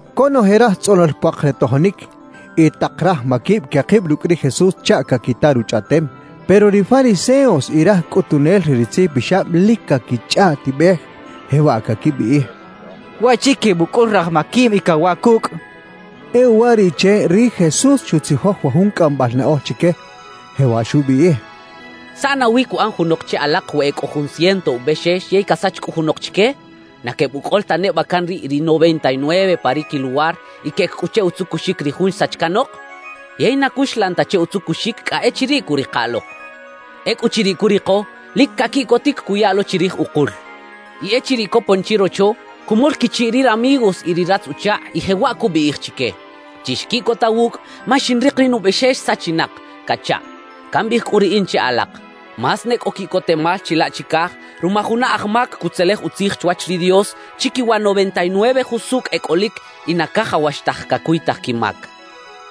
Conoje raj tzꞌonol puak re tojonic y tak raj maquib quekib rucꞌ ri Jesús chaꞌ caquita ruchꞌaꞌtem. Pero ri fariseos y raj cꞌutunel re ri tzijpixab lic caquichꞌaꞌtibej, jewaꞌ caquibiꞌij: «Waꞌchi quebucꞌul raj maquib y cawaꞌ cucꞌ» quechaꞌ. E uwariꞌche ri Jesús xutzijoj wa jun cꞌambal naꞌoj chique, jewaꞌ xubiꞌij: «¿Saꞌ nawi cuꞌan junok che alak we e cꞌo jun ciento ubexex yey casach cꞌu junok chique? ¿Na quebucꞌol ta neba can riꞌ ri noventa y nueve pa ri quiluwar y queꞌec cꞌu che utzucuxic ri jun xsach canok? Yey na cuxlan ta che utzucuxic cꞌa echiriꞌ cuꞌrika lok. Ecꞌuchiriꞌ curiko, lic caquiꞌcotic cuya lo chirij ukul. Y echiriꞌ copon chirocho, cumol quichiꞌ ri ramigos y ri ratz-uchakꞌ, y jewaꞌ cubiꞌij chique: “Chixquiꞌcota wucꞌ ma xinrik ri nubexex sachinak” cachaꞌ. »Cambiꞌij cꞌu riꞌin che alak: Más ne cꞌo quiꞌcotemal chilaꞌ chicaj ruma juna aj mac cutzelej utzij chwach ri Dios, chiquiwa noventa y nueve jusucꞌ e cꞌolic y na cajawax taj cacuytaj quimac.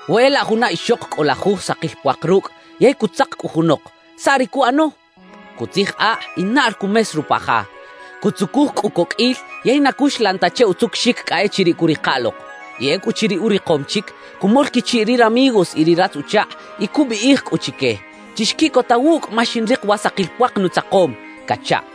»We e laꞌ juna ixok cꞌo lajuj sakil puak rucꞌ yey cutzak cꞌu junok, ¿saꞌ ri cuꞌano? Cutzij akꞌ y naꞌl cumes rupa ja, cutzucuj cꞌu coqꞌuil yey na cuxlan ta che utzucuxic cꞌa echiriꞌ cuꞌrika lok. Y ecꞌuchiriꞌ urikom chic, cumol quichiꞌ ri ramigos y ri ratz-uchakꞌ y cubiꞌij cꞌu chique: “Chixquiꞌcota wucꞌ ma xinrik wa sakil puak nutzakom” cachaꞌ.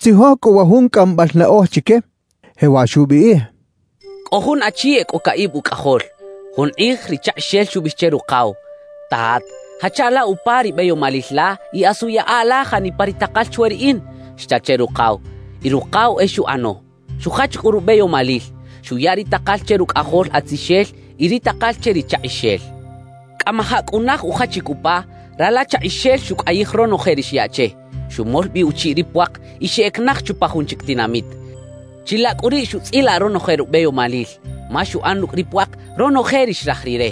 Xutzijoj cꞌu wa jun cꞌambal naꞌoj chique, jewaꞌ xubiꞌij: «Cꞌo jun achi e cꞌo caꞌib ucꞌajol. Jun kꞌij ri chakꞌixel xubiꞌij che rukaw: “Tat, jacha la upa ri beyomalil la y asu yaꞌa la janipa ri takal chwe riꞌin” xcha che rukaw. Y rukaw e xuꞌano. Xujach cꞌu rubeyomalil, xuya ri takal che rucꞌajol atzixel y ri takal che ri chakꞌixel. »Cꞌamajaꞌ cꞌu naj ujachic upa, rala chakꞌixel xucꞌayij ronoje ri xyaꞌ che, xumol bi uchiꞌ ri puak y xeꞌec naj chupa jun chic tinamit. Chilaꞌ cꞌu riꞌ xutzꞌilaꞌ ronoje rubeyomalil, ma xuꞌan rucꞌ ri puak ronoje ri xraj rire.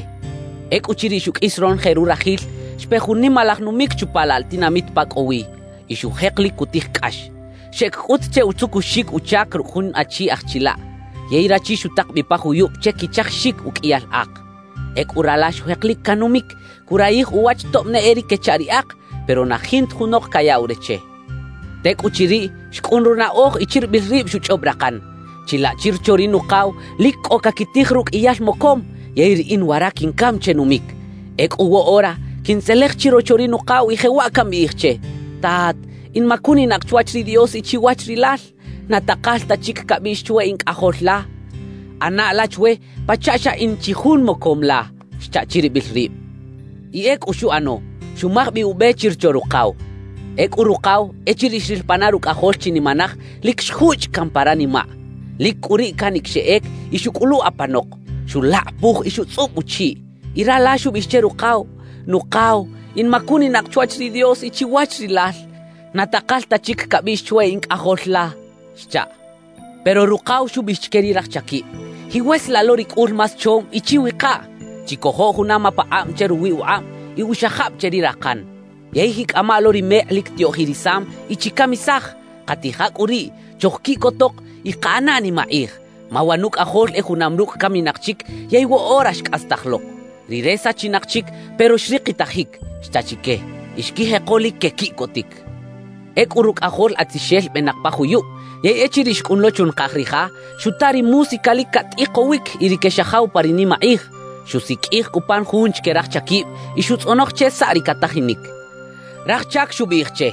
Ecꞌuchiriꞌ xuqꞌuis ronoje rurajil, xpe jun nimalaj numic chupa laꞌ la tinamit pa cꞌo wi. Y xujek lic cutij cꞌax. »Xeꞌec cꞌut che utzucuxic uchac rucꞌ jun achi aj chilaꞌ. Yey rachi xutak bi pa juyub che quichajixic uqꞌuiyal ak. Ecꞌu rala xujek lic canumic, curayij uwach tob ne e ri quechaꞌ ri ak, pero na jinta junok cayaꞌw re che. »Tecꞌuchiriꞌ, xcꞌun runaꞌoj y chiribil rib xuchꞌob rakan: “Chilaꞌ chirocho ri nukaw lic cꞌo caquitij ruqꞌuiyal mocom; yey riꞌin wara quincam che numic. Ecꞌu woꞌora quintzelej chirocho ri nukaw y jewaꞌ cambiꞌij che: Tat, in macuninak chwach ri Dios y chiwach rilal. Na takal ta chic cabiꞌx chwe in cꞌajol la. ꞌAna la chwe pachaꞌ xa in chi jun mocom la” xcha chiribil rib. Y ecꞌu xuꞌano. Xumaj bi ube chirocho rukaw. »Ecꞌu rukaw, echiriꞌ xril pana rucꞌajol chinimanaj, lic xjuchꞌ caꞌn pa ranimaꞌ. Lic cꞌu riꞌ canic xeꞌec y xuꞌcꞌulu apanok. Xulakꞌapuj y xutzꞌub uchiꞌ. »Y rala xubiꞌij che rukaw: “Nukaw, in macuninak chwach ri Dios y chiwach rilal. Na takal ta chic cabiꞌx chwe in cꞌajol la” xchaꞌ. »Pero rukaw xubiꞌij chique ri raj chaquib: “Jiꞌwesalaꞌ lo ri cꞌul más chom y chiwikaꞌ. Chicojo juna mapakꞌab che ruwi ukꞌab y uxajab che ri rakan. Yey jiꞌcꞌama lo ri mekꞌ lic tiꞌoꞌjirisam y chicamisaj. Katija cꞌu riꞌ, chojquiꞌcotok y kaꞌana nimakꞌij, ma wa nucꞌajol e junam rucꞌ caminak chic yey woꞌora xcꞌastaj lok. Rire sachinak chic pero xrikitajic” xcha chique. Y xquijeko lic quequiꞌcotic. »Ecꞌu rucꞌajol atzixel benak pa juyub; yey echiriꞌ xcꞌun lo chunakaj ri ja, xuta ri música lic catꞌikowic y ri quexajaw pa ri nimakꞌij. Xusiqꞌuij cꞌu pan jun chique raj chaquib y xutzꞌonoj che saꞌ ri catajinic. »Raj chac xubiꞌij che: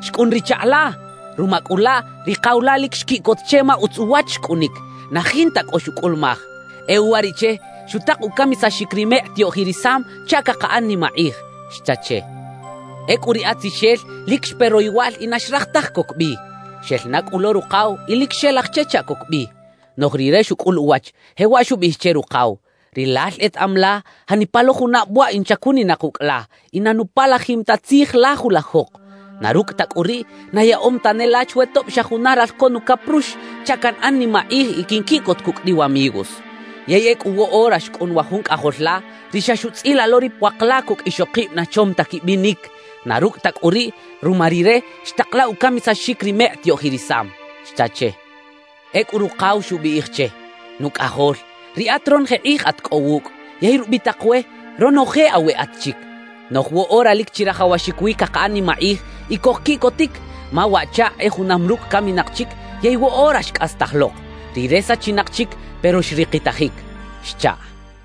“Xcꞌun ri chakꞌ la. Ruma cꞌu laꞌ, ri kaw la lic xquiꞌcot che ma utz uwach xcꞌunic, na jinta cꞌo xucꞌulumaj. E uwariꞌche, xutak ucamisaxic ri mekꞌ tiꞌoꞌjirisam chaꞌ cakaꞌan nimakꞌij” xcha che. »Ecꞌu ri atzixel lic xpe royowal y na xraj taj coc bi. Xel na cꞌu lo rukaw y lic xelaj che chaꞌ coc bi. Noꞌj rire xucꞌul uwach, jewaꞌ xubiꞌij che rukaw: “Rilal etaꞌam la janipa lo junab waꞌ in chacuninak ucꞌ la y na nupalajim ta tzij la julajok. Na rucꞌ ta cꞌu riꞌ, na yaꞌom tane la chwe tob xa juna ralco nucaprux chaꞌ canꞌan nimakꞌij y quinquiꞌcot cucꞌ ri wamigos. Yey ecꞌu woꞌora xcꞌun wa jun cꞌajol la, ri xa xuꞌtzꞌilaꞌ lo ri puak la cucꞌ ixokib na chom ta quibinic; na rucꞌ ta cꞌu riꞌ, ruma rire, xtak la ucamisaxic ri mekꞌ tiꞌoꞌjirisam” xcha che. »Ecꞌu rukaw xubiꞌij che: “Nucꞌajol, riꞌat ronoje kꞌij at cꞌo wucꞌ, yey rubitak we, ronoje aweꞌat chic. Noꞌj woꞌora lic chirajawaxic wi cakaꞌan nimakꞌij y cojquiꞌcotic, ma waꞌchakꞌ e junam rucꞌ caminak chic yey woꞌora xcꞌastaj lok. Rire sachinak chic pero xrikitajic” xchaꞌ.»